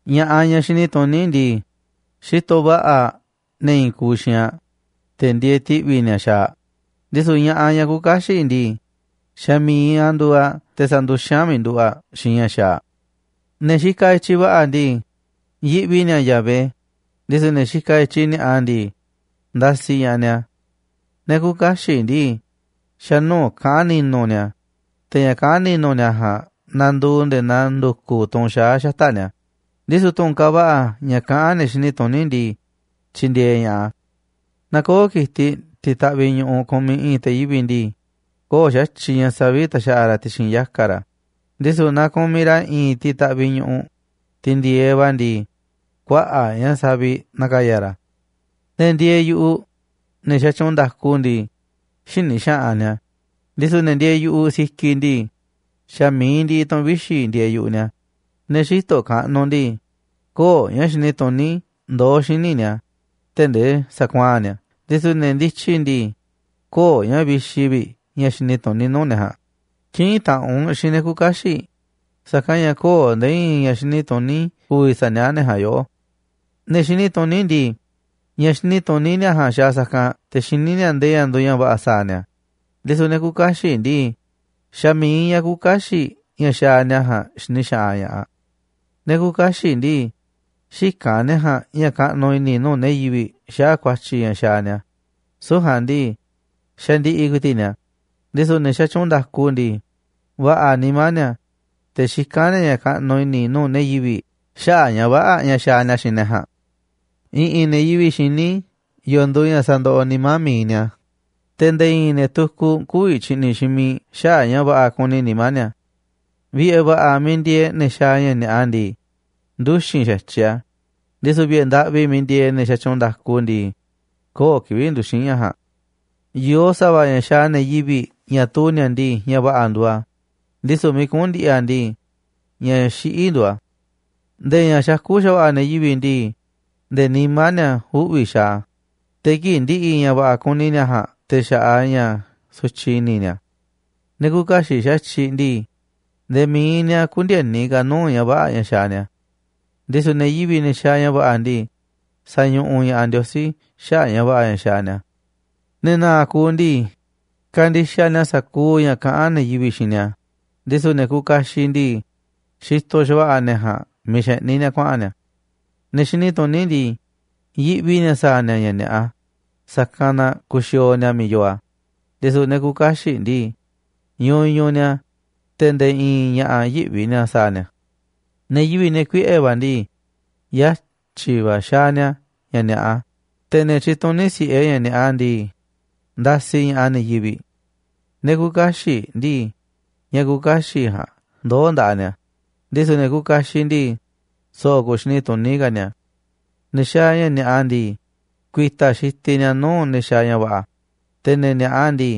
Ña̱ꞌaꞌ, ñaꞌ xini tuní ndii, xitoꞌ va̱ꞌa̱ aꞌ ne̱ i̱i̱n kuuꞌ xiinꞌ aꞌ, te̱ ndieeꞌ ti̱ꞌvi̱ ni̱a̱ xaaꞌ aꞌ, ndisu̱ ña̱ꞌaꞌ, ñaꞌ küuꞌ kaxiꞌ ndii, xa̱ mi̱iꞌ aꞌ nduuꞌ aꞌ te̱ sanduxín aꞌ miiꞌ nduꞌu̱ꞌ aꞌ xiinꞌ ña̱ xaaꞌ aꞌ. Ne̱ xikaꞌ i̱tyiꞌ va̱ꞌa̱ ndii, yiꞌvi ni̱a̱ Yahvé, ndisu̱ ne̱ xikaꞌ i̱tyiꞌ ni̱a̱ꞌa ndii, ndasiꞌ ña̱ꞌaꞌ ni̱a̱. Ne̱ küuꞌ kaxiꞌ ndii, xa̱ nuu̱ꞌ kaꞌán ni̱nu̱ ni̱a̱, te̱ ña̱ kaꞌán ni̱nu̱ ni̱a̱ ja̱a̱nꞌ nanduuꞌ nde̱e̱ naa ndu̱ku̱ tunꞌ xaá xata̱ꞌ ni̱a̱, ndisu̱ tu̱ꞌu̱n kaaꞌ va̱ꞌa̱ ña̱ kaꞌán ne̱ xini tuní ndii, tyindieeꞌ ña̱ꞌaꞌ a̱. Naaꞌ köo̱ꞌ ki̱tiꞌ tiꞌ taꞌviꞌ ñu̱ꞌuꞌ kumiꞌ i̱i̱n te̱ yivi̱ꞌ ndii, köo̱ꞌ xa̱tyiꞌ ña̱ saviꞌ ta̱xa̱ꞌa̱ ra̱ ti̱xi̱n yaka̱ ra̱, ndisu̱ naa kumiꞌ ra̱ i̱i̱n tiꞌ taꞌviꞌ ñu̱ꞌuꞌ, tiꞌ ndi̱e̱eꞌ va̱ ndii, kuaꞌa̱ꞌ ña̱ saviꞌ na̱ka̱ya̱ ra̱. Ne̱ ndieeꞌ yu̱ꞌuꞌ, ne̱ xatyuunꞌ nda̱ku ndii, xïni xaꞌanꞌ ni̱a̱, ndisu̱ ne̱ ndieeꞌ yu̱ꞌuꞌ sikiꞌ ndii, xa̱ mi̱iꞌ ndiꞌiꞌ tu̱ꞌu̱n vixi̱ ndieeꞌ yu̱ꞌuꞌ ni̱a̱. Ne̱ xïtoꞌ kaꞌnuꞌ ndii, köo̱ꞌ ña̱ xini tuní ndoó xíniꞌ ni̱a̱ tee̱ꞌ nde̱e̱ sakuaa̱n ni̱a̱ a̱, ndisu̱ ne̱ ndityi ndii, köo̱ꞌ ña̱ vixi vi̱ꞌ ña̱ xini tuní nuu̱ꞌ ne̱ ja̱a̱nꞌ. Kï̱ꞌi̱n taꞌanꞌ u̱nꞌ xiinꞌ ne̱ küuꞌ kaxiꞌ, sa̱kanꞌ ña̱ köo̱ꞌ nde̱e̱ i̱i̱n ña̱ xini tuní ku̱vi̱ sa̱niaꞌá ne̱ ja̱a̱nꞌ yoꞌó. Ne̱ xini tuní ndii, ña̱ xini tuní ni̱a̱ ja̱a̱nꞌ xaaꞌ sa̱kanꞌ te̱ xiní ni̱a̱ ndee ña̱ nduuꞌ ña̱ va̱ꞌa̱ sa̱a̱ ni̱a̱, ndisu̱ ne̱ küuꞌ kaxiꞌ ndii, xa̱ mi̱iꞌ ña̱ küuꞌ kaxiꞌ ña̱ xaaꞌ ni̱a̱ ja̱a̱nꞌ xini xaꞌanꞌ ña̱ꞌaꞌ. Ne̱ küuꞌ kaxiꞌ ndii, xïkán ne̱ ja̱a̱nꞌ ña̱ kaꞌnuꞌ i̱ni̱ nuu̱ꞌ ne̱ yivi̱ꞌ xaꞌa̱ꞌ ku̱a̱tyi̱ ña̱ xaaꞌ ni̱a̱, süu̱ꞌ ja̱a̱nꞌ ndii, xandiꞌiꞌ ku̱i̱ti̱ꞌ ni̱a̱, ndisu̱ ne̱ xatyuunꞌ nda̱ku ndii, va̱ꞌa̱ nimá ni̱a̱, te̱ xikán ni̱a̱ ña̱ kaꞌnuꞌ i̱ni̱ nuu̱ꞌ ne̱ yivi̱ꞌ xaꞌa̱ꞌ ña̱ vä̱ꞌa̱ ña̱ xaaꞌ ni̱a̱ xiinꞌ ne̱ ja̱a̱nꞌ. I̱ꞌi̱n ne̱ yivi̱ꞌ xiní yo̱o̱ nduuꞌ ña̱ sandoꞌoꞌ nimá mi̱iꞌ ni̱a̱, te̱ nde̱e̱ i̱i̱n ne̱ tukuꞌ kü̱vi̱ tyi̱ꞌni̱ xiinꞌ miiꞌ xaꞌa̱ꞌ ña̱ va̱ꞌa̱ kuni nimá ni̱a̱. Vi̱ꞌe̱ va̱ꞌa̱ miiꞌ ndieeꞌ ne̱ xaaꞌ ña̱ ni̱a̱ꞌa ndii, nduxi̱n xa̱tyiꞌ a̱, ndisu̱ vi̱ꞌe̱ ndaꞌvi miiꞌ ndieeꞌ ne̱ xatyuunꞌ nda̱ku ndii, köo̱ꞌ kivi̱ꞌ nduxi̱n ña̱ ja̱a̱nꞌ. Yoo sa̱va̱ ña̱ xaaꞌ ne̱ yivi̱ꞌ ña̱ tuu ni̱a̱ ndii, ña̱ va̱ꞌa̱ nduuꞌ a̱, ndisu̱ miiꞌ kuꞌu̱n ndi̱ꞌi̱ a̱ ndii, ña̱ xiꞌí nduuꞌ a̱. Nde̱e̱ ña̱ xakú xa̱va̱ꞌa̱ ne̱ yivi̱ꞌ ndii, nde̱e̱ nimá ni̱a̱ uꞌvi̱ xaaꞌ a̱, te̱ kii̱ꞌ ndiꞌiꞌ ña̱ va̱ꞌa̱ kuni ni̱a̱ ja̱a̱nꞌ te̱ xaꞌaꞌ ña̱ sutyiꞌ i̱ni̱ ni̱a̱. Ne̱ küuꞌ kaxiꞌ xa̱tyiꞌ ndii, nde̱e̱ mi̱iꞌ ni̱a̱ kündieni ka̱ nuu̱ꞌ ña̱ vä̱ꞌa̱ ña̱ xaaꞌ ni̱a̱, ndisu̱ ne̱ yivi̱ꞌ, ne̱ xaaꞌ ña̱ va̱ꞌa̱ ndii, sa̱ñuꞌuꞌ ña̱ꞌaꞌ Ndiosí xaꞌa̱ꞌ ña̱ va̱ꞌa̱ ña̱ xaaꞌ ni̱a̱. Ne̱ na̱a̱ꞌ kuuꞌ ndii, kandixaꞌ ni̱a̱ sa̱kuuꞌ ña̱ kaꞌán ne̱ yivi̱ꞌ xiinꞌ ni̱a̱, ndisu̱ ne̱ kuuꞌ kaxiꞌ ndii, xitoꞌ xa̱va̱ꞌa̱ ne̱ ja̱a̱nꞌ miiꞌ xeꞌní ni̱a̱ kuaꞌa̱n ni̱a̱. Ne̱ xini tuní ndii, yiꞌvi ni̱a̱ sa̱a̱ ni̱a̱ ña̱ ni̱a̱ꞌa, sa̱kanꞌ na kuxiooꞌ ni̱a̱ miiꞌ yoo a̱, ndisu̱ ne̱ küuꞌ kaxiꞌ ndii, ñuñuꞌ ni̱a̱, te̱ nde̱e̱ i̱i̱n ña̱ꞌa̱ yïꞌvi ni̱a̱ sa̱a̱ ni̱a̱. Ne̱ yivi̱ꞌ, ne̱ kuiꞌe̱ va̱ ndii, yatyi̱ va̱ xaaꞌ ni̱a̱ ña̱ ni̱a̱ꞌa, te̱ ne̱ tyituní si̱ꞌe ña̱ ni̱a̱ꞌa ndii, ndasiꞌ ña̱ꞌaꞌ ne̱ yivi̱ꞌ. Ne̱ küuꞌ kaxiꞌ ndii, ña̱ küuꞌ kaxiꞌ ja̱a̱nꞌ ndoo̱ nda̱ꞌaꞌ ni̱a̱, ndisu̱ ne̱ kuuꞌ kaxiꞌ ndii, so̱ꞌo̱ ku̱u̱ xini tuní ka̱ ni̱a̱. Ne̱ xaaꞌ ña̱ ni̱a̱ꞌa ndii, ku̱i̱ta̱ xitiꞌ ni̱a̱ nuu̱ꞌ ne̱ xaaꞌ ña̱ va̱ꞌa̱, te̱ ne̱ ni̱a̱ꞌa ndii,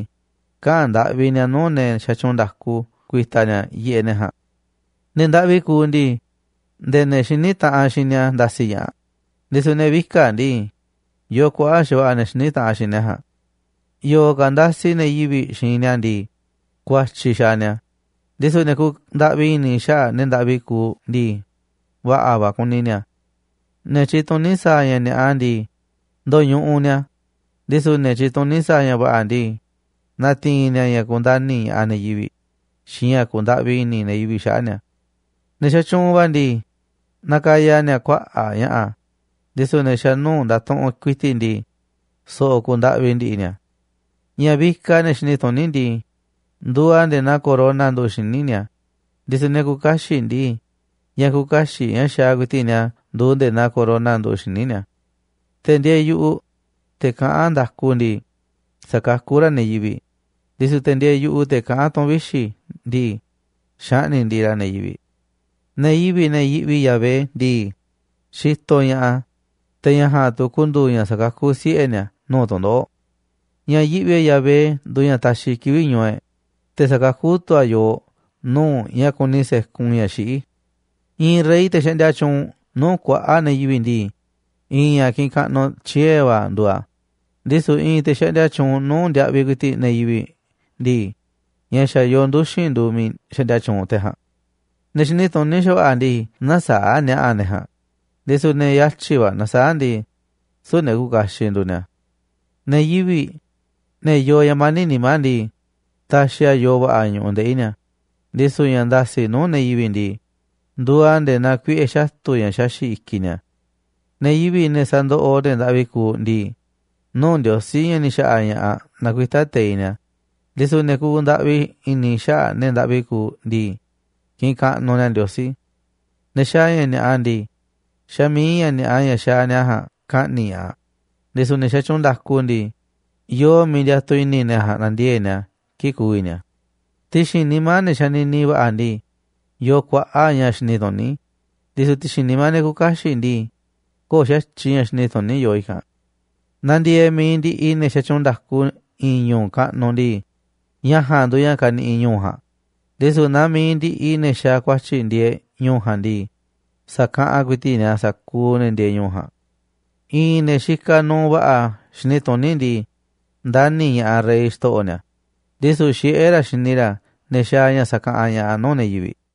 kaꞌa̱n ndaꞌvi ni̱a̱ nuu̱ꞌ ne̱ xatyuunꞌ nda̱ku ku̱i̱ta̱ ni̱a̱ yiꞌeꞌ ne̱ ja̱a̱nꞌ. Ne̱ ndaꞌvi kuuꞌ ndii, nde̱e̱ ne̱ xiní taꞌanꞌ xiinꞌ ni̱a̱ ndasiꞌ ña̱ꞌaꞌ, ndisu̱ ne̱ vika̱ꞌ ndii, yoo kuaꞌa̱ꞌ xa̱va̱ꞌa̱ ne̱ xiní taꞌanꞌ xiinꞌ ne̱ ja̱a̱nꞌ. Yo̱o̱ ka̱ ndasiꞌ ne̱ yivi̱ꞌ xiinꞌ ni̱a̱ ndii, ku̱a̱tyi̱ xaaꞌ ni̱a̱, ndisu̱ ne̱ kuuꞌ ndaꞌvi i̱ni̱ xaꞌa̱ꞌ ne̱ ndaꞌvi kuuꞌ ndii, va̱ꞌa̱ va̱ kuni ni̱a̱. Ne̱ tyituní sa̱a̱ ña̱ ni̱a̱ꞌa ndii, ndoñuꞌuꞌ ni̱a̱, ndisu̱ ne̱ tyituní sa̱a̱ ña̱ va̱ꞌa̱ ndii, na̱ti̱i̱n ni̱a̱ ña̱ kundani̱ ña̱ꞌaꞌ ne̱ yivi̱ꞌ xiinꞌ ña̱ ku̱u̱ ndaꞌvi i̱ni̱ ne̱ yivi̱ꞌ xaꞌa̱ꞌ ni̱a̱. Ne̱ xatyuunꞌ va̱ ndii, nakaya ni̱a̱ kuaꞌa̱ꞌ ña̱ꞌa̱, ndisu̱ ne̱ xa̱ nuu̱ꞌ ndatuꞌunꞌ ku̱i̱ti̱ꞌ ndii, so̱ꞌo̱ kuuꞌ ndaꞌvi ndi̱ꞌi̱ ni̱a̱. Ña̱ vikaꞌ ne̱ xini tuní ndii, nduuꞌ a̱ nde̱e̱ naa corona nduꞌu̱ꞌ xíniꞌ ni̱a̱, ndisu̱ ne̱ küuꞌ kaxiꞌ ndii, ña̱ küuꞌ kaxiꞌ ña̱ xaaꞌ ku̱i̱ti̱ꞌ ni̱a̱ nduuꞌ nde̱e̱ naa corona nduꞌu̱ꞌ xíniꞌ ni̱a̱. Te̱ ndieeꞌ yu̱ꞌuꞌ, te̱ kaꞌán nda̱ku ndii, sakakú ra̱ ne̱ yivi̱ꞌ, ndisu̱ te̱ ndieeꞌ yu̱ꞌuꞌ, te̱ kaꞌán tu̱ꞌu̱n vixi̱ ndii, xaꞌni̱ꞌ ndiꞌiꞌ ra̱ ne̱ yivi̱ꞌ. Ne̱ yivi̱ꞌ, ne̱ yiꞌvi Yahvé ndii, xitoꞌ ña̱ꞌaꞌ a̱, te̱ ña̱ ja̱a̱nꞌ tu̱ ku̱ndu̱u̱ ña̱ sa̱kakú siꞌe̱ ni̱a̱ nuu̱ꞌ tu̱ndoꞌo̱ꞌ. Ña̱ yiꞌvi e̱ꞌ Yahvé nduuꞌ ña̱ taxiꞌ kivi̱ꞌ ñu̱u̱ e̱ꞌ, te̱ sakakú tu̱ a̱ yooꞌ nuu̱ꞌ ña̱ kuni se̱kun ña̱ xiꞌí. I̱i̱n rey, te̱ xaꞌndia tyuunꞌ nuu̱ꞌ kuaꞌa̱ꞌ ne̱ yivi̱ꞌ ndii, i̱i̱n ña̱ kiꞌinꞌ kaꞌnuꞌ tyie̱ va̱ nduuꞌ a̱, ndisu̱ i̱i̱n te̱ xaꞌndia tyuunꞌ nuu̱ꞌ ndiaꞌviꞌ ku̱i̱ti̱ꞌ ne̱ yivi̱ꞌ ndii, ña̱ xa̱ yoo nduxi̱n nduuꞌ miiꞌ xaꞌndia tyuunꞌ te̱ ja̱a̱nꞌ. Ne̱ xini tuní xa̱va̱ꞌa̱ ndii, näsaáꞌ ni̱a̱ꞌa̱ ne̱ ja̱a̱nꞌ, ndisu̱ ne̱ yatyi̱ va̱ nasaáꞌ ndii, süu̱ꞌ ne̱ kuuꞌ kaxiꞌ nduuꞌ ni̱a̱. Ne̱ yivi̱ꞌ, ne̱ yoo ña̱ mani̱ꞌ nimá ndii, taxiꞌ a̱ yoo va̱ꞌa̱ ñu̱ꞌuꞌ ndeꞌi̱ ni̱a̱, ndisu̱ ña̱ nda̱si̱ꞌ nuu̱ꞌ ne̱ yivi̱ꞌ ndii, nduuꞌ a̱ nde̱e̱ naa kuiꞌe̱ xatu̱ ña̱ xaxi̱ꞌ i̱kiꞌ ni̱a̱. Ne̱ yivi̱ꞌ, ne̱ sandoꞌoꞌ ne̱ ndaꞌvi kuuꞌ ndii, nuu̱ꞌ Ndiosí, ña̱ ni̱ xa̱ꞌa̱ ña̱ꞌaꞌ, nakuitá teiꞌ ni̱a̱, ndisu̱ ne̱ kuuꞌ ndaꞌvi i̱ni̱ xaꞌa̱ꞌ ne̱ ndaꞌvi kuuꞌ ndii, kiꞌinꞌ kaꞌnuꞌ ni̱a̱ Ndiosí. Ne̱ xaaꞌ ña̱ ni̱a̱ꞌa ndii, xa̱ mi̱iꞌ ña̱ ni̱a̱ꞌa ña̱ xaaꞌ ni̱a̱ ja̱a̱nꞌ ka̱ꞌni̱ꞌ ña̱ꞌaꞌ, ndisu̱ ne̱ xatyuunꞌ nda̱ku ndii, yoo miiꞌ ndiatuꞌ i̱ni̱ ne̱ ja̱a̱nꞌ na̱ndiee̱ꞌ ni̱a̱ kii̱ꞌ ku̱vi̱ ni̱a̱. Ti̱xi̱n nimá ne̱ xanini va̱ꞌa̱ ndii, yoo kuaꞌa̱ꞌ ña̱ xini tuní, ndisu̱ ti̱xi̱n nimá ne̱ küuꞌ kaxiꞌ ndii, köo̱ꞌ xa̱tyiꞌ ña̱ xini tuní yoo i̱kanꞌ. Naaꞌ ndieeꞌ mi̱iꞌ ndiꞌiꞌ ne̱ xatyuunꞌ nda̱ku i̱i̱n ñu̱u̱ kaꞌnuꞌ ndii, ña̱ ja̱a̱nꞌ nduuꞌ ña̱ kaniꞌiꞌ ñu̱u̱ ja̱a̱nꞌ, ndisu̱ naaꞌ mi̱iꞌ ndiꞌiꞌ ne̱ xaaꞌ ku̱a̱tyi̱ ndieeꞌ ñu̱u̱ ja̱a̱nꞌ ndii, sa̱kaꞌanꞌ ku̱i̱ti̱ꞌ ni̱a̱ sa̱kuuꞌ ne̱ ndieeꞌ ñu̱u̱ ja̱a̱nꞌ. I̱i̱n ne̱ xikaꞌ nuuꞌ va̱ꞌa̱ xini tuní ndii, ndani̱ ña̱ꞌaꞌ rey, xto̱ꞌo̱ ni̱a̱, ndisu̱ xiꞌé ra̱ xini ra̱ ne̱ xaaꞌ ña̱ sakaꞌanꞌ ña̱ꞌaꞌ nuu̱ꞌ ne̱ yivi̱ꞌ.